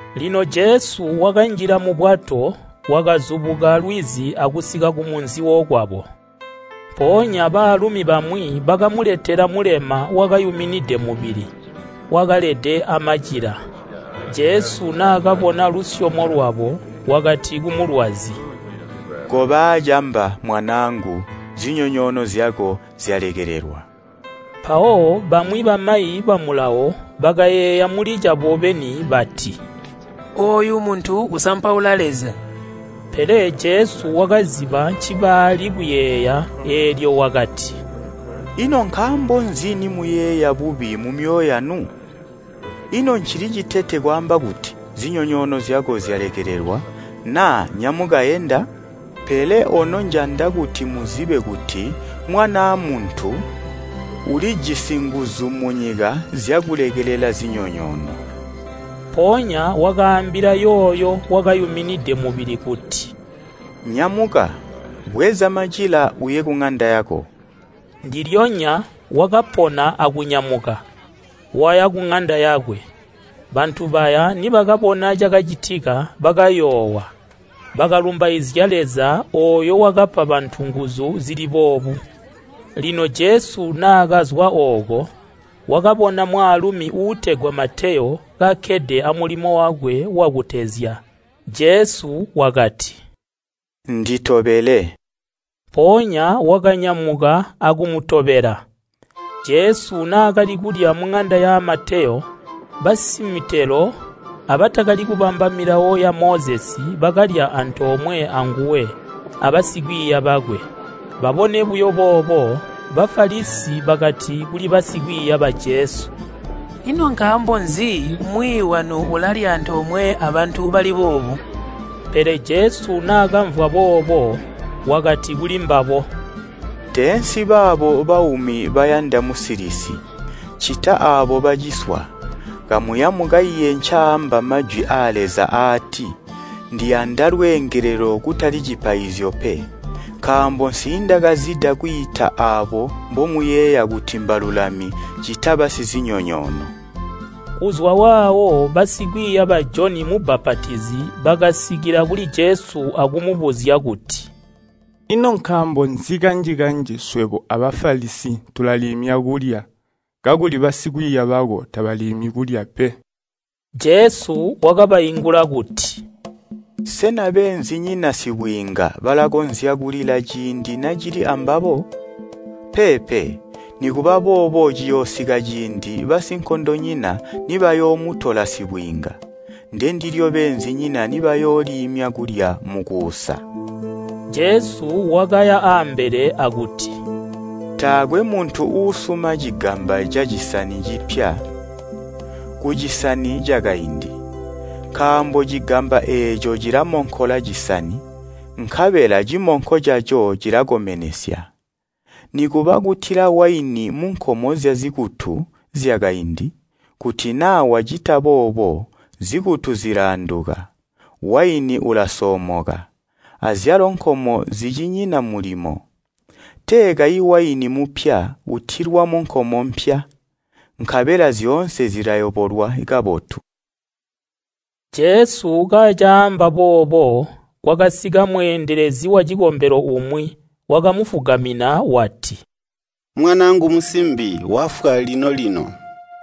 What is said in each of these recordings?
Lino Jesu wakanjila mubwato wakazubuka lwizi akusika kumunzi wokwabo. Mpoonya baalumi bamwi bakamuletela mulema wakayuminide mubili, wakalede amacila. Jesu naakabona lusyomo lwabo wakati kumulwazi, “Koba aacamba mwanaangu zinyonyoono zyako zyalekelelwa.” Mpawo bamwi bamayi ba Mulawo bakayeeya muli cabo beni bati, “Ooyu muntu usampaula Leza.” Pele Jesu wakaziba ncibaali kuyeeya eelyo wakati, “Ino nkaambo nzi nimuyeeya bubi mumyoyo yanu? Ino ncili citete kwaamba kuti, ‘Zinyonyoono zyako zyalekelelwa’ naa ‘Nyamuka enda?’ Pele ono njanda kuti muzibe kuti Mwanaa Muntu ulijisi nguzu munyika zyakulekelela zinyonyoono.” Mpoonya wakaambila yooyo wakayuminide mubili kuti, “Nyamuka, bweza macila uye kuŋanda yako!” Ndilyonya wakapona akunyamuka, waya kuŋanda yakwe. Bantu baya nibakabona cakacitika bakayoowa, bakalumbaizya Leza ooyo wakapa bantu nguzu zili boobu. Lino Jesu naakazwa ooko, wakabona mwaalumi uutegwa Mateyo kakkede amulimo wakwe, Jesu wakati, “Nditobele.” Mpoonya wakanyamuka akumutobela. Jesu naakali kulya muŋanda ya Mateyo, basimitelo abatakali kubamba milawo ya Mozesi bakalya antoomwe anguwe abasikwiiya bakwe. Babone buyo boobo, Bafalisi bakati kuli basikwiiya ba Jesu, “Ino nkaambo nzi mwiiyi wanu ulalya aantoomwe abantu bali boobu?” Pele Jesu naakamvwa boobo, wakati kulimbabo “Teensi baabo baumi bayanda musilisi, ccita aabo baciswa. Kamuya mukaiye ncaaamba majwi aa Leza aati, ‘Ndiyanda lweengelelo kutali cipaizyo pe?’ Nkaambo nsiindakazida kwiita aabo mbomuyeeya kuti mbalulami ccita basizinyonyoono.” Kuzwa waawo basikwiiya ba Joni mubapatizi bakasika kuli Jesu akumubuzya kuti, “Ino nkaambo nzi kanji-kanji swebo a Bafalisi tulaliimya kulya kakuli basikwiiya bako tabaliimyi pe?” Jesu wakabaingula kuti, “Sena beenzinyina sibwiinga balakonzya kulila ciindi nacili ambabo? Peepe, nikuba boobo ciyoosika ciindi basinkondonyina nibayoomutola sibwiinga, ndendilyo beenzinyina nibayooliimya kulya mukuusa.” Jesu wakaya ambele akuti, “Taakwe muntu uusuma cigamba cacisani cipya kucisani cakaindi. Nkaambo cigamba eeco cilamonkola cisani, nkabela cimonko caco cilakomenesya. Nikuba kutila waini munkomo zyazikutu zyakaindi, kuti naa wacita boobo, zikutu zilaanduka, waini ulasoomoka, azyalo nkomo zicinyina mulimo. Tee kayi waini mupya utilwa munkomo mpya, nkabela zyoonse zilayobolwa kabotu.” Jesu kacaamba boobo kwakasika mweendelezi wacikombelo umwi wakamufugamina wati, “Mwanaangu musimbi wafwa lino-lino.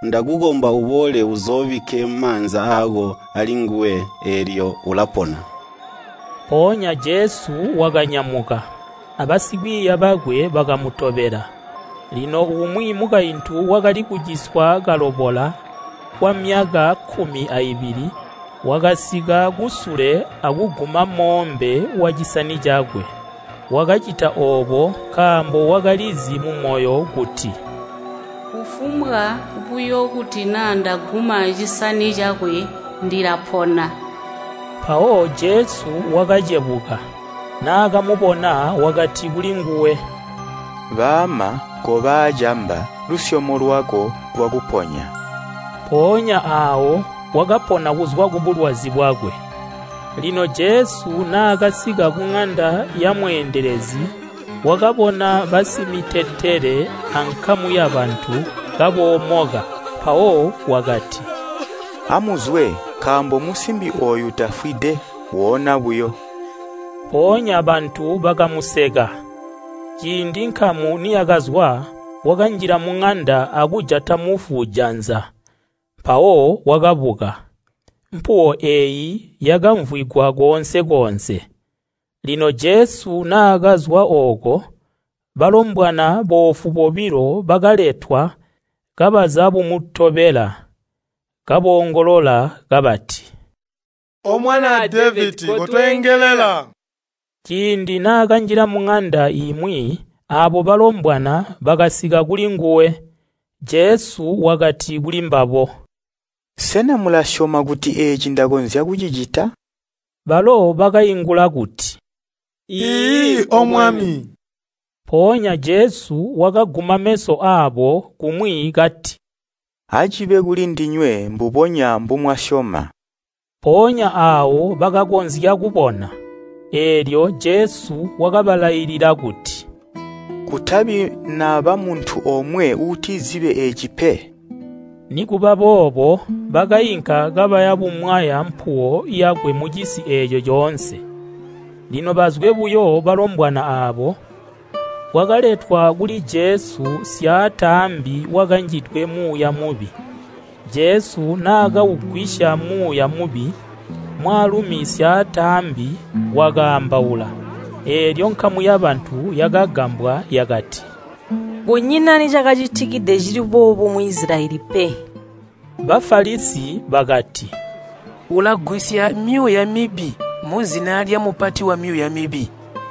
Ndakukomba uboole uzoobikke maanza aako alinguwe, eelyo ulapona.” Mpoonya Jesu wakanyamuka, abasikwiiya bakwe bakamutobela. Lino umwi mukaintu wakali kuciswa kalobola kwamyaka kkumi aibili, wakasika kusule akuguma moombe wacisani cakwe. Wakacita oobo nkaambo wakalizi mumoyo kuti, “Kufumbwa buyo kuti naa ndaguma cisani cakwe, ndilapona.” Mpawo Jesu wakacebuka, naakamubona wakati kulinguwe, “Baama koba aacamba lusyomo lwako lwakuponya.” Mpoonya aawo wakapona kuzwa kubulwazi bwakwe. Lino Jesu naakasika kuŋanda yamweendelezi wakabona basimitetele ankamu yabantu kaboomoka. Mpawo wakati, “Amuzwe nkaambo musimbi ooyu tafwide, woona buyo.” Mpoonya bantu bakamuseka. Ciindi nkamu niyakazwa, wakanjila munanda akujata mufu janza, mpawo wakabuka. Mpuwo eeyo yakamvwigwa koonse-koonse. Lino Jesu naakazwa ooko, balombwana boofu bobilo bakaletwa kabazabumutobela, kaboongolola kabati, “O Mwanaa Devedi kotweengelela.” Ciindi naakanjila muŋanda imwi aabo balombwana bakasika kulinguwe. Jesu wakati kulimbabo, “Sena mulasyoma kuti eeci ndakonzya kucicita?” Balo bakaingula kuti, “Iiyi O Mwami.” Mpoonya Jesu wakaguma meso aabo kumwi kati, “Acibe kulindinywe mbubonya mbumwasyoma.” Mpoonya aawo bakakonzya kubona. Eelyo Jesu wakabalailila kuti, “Kutabi naba muntu omwe uutizibe eeci pe!” Nikuba boobo bakainka kabaya bumwaya mpuwo yakwe mucisi eeco coonse. Lino bazwe buyo balombwana aabo, kwakaletwa kuli Jesu syaataambi wakanjidwe muuya mubi. Jesu naakaugwisya muuya mubi, mwaalumi syaataambi wakaambaula. Eelyo nkamu yabantu yakagambwa yakati, “Kunyina nicakacitikide cili boobu mu Isilayeli pe.” Bafalisi bakati, “Ulagwisya myuuya mibi muzina lyamupati wamyuuya mibi.”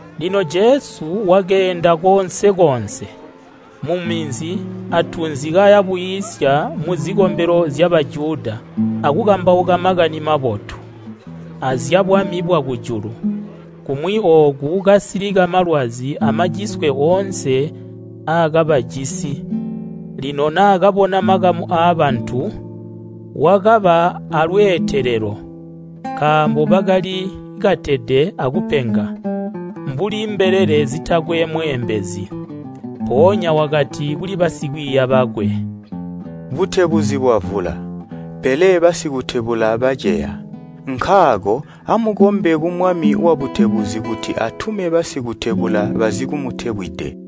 Lino Jesu wakeenda koonse-koonse, muminzi atunzi kaya bwiisya muzikombelo zya Bajuda akukambauka Makani Mabotu aazyabwami bwa kujulu, kumwi ooku kasilika malwazi amaciswe oonse aakabajisi. Lino naakabona makamu aabantu, wakaba aalweetelelo, nkaambo bakali katede akupenga, mbuli mbelele zitakwe mweembezi. Mpoonya wakati kuli basikwiiya bakwe, “Butebuzi bwavula, pele basikutebula baceya. Nkaako amukombe ku Mwami wabutebuzi kuti atume basikutebula bazikumutebwide.”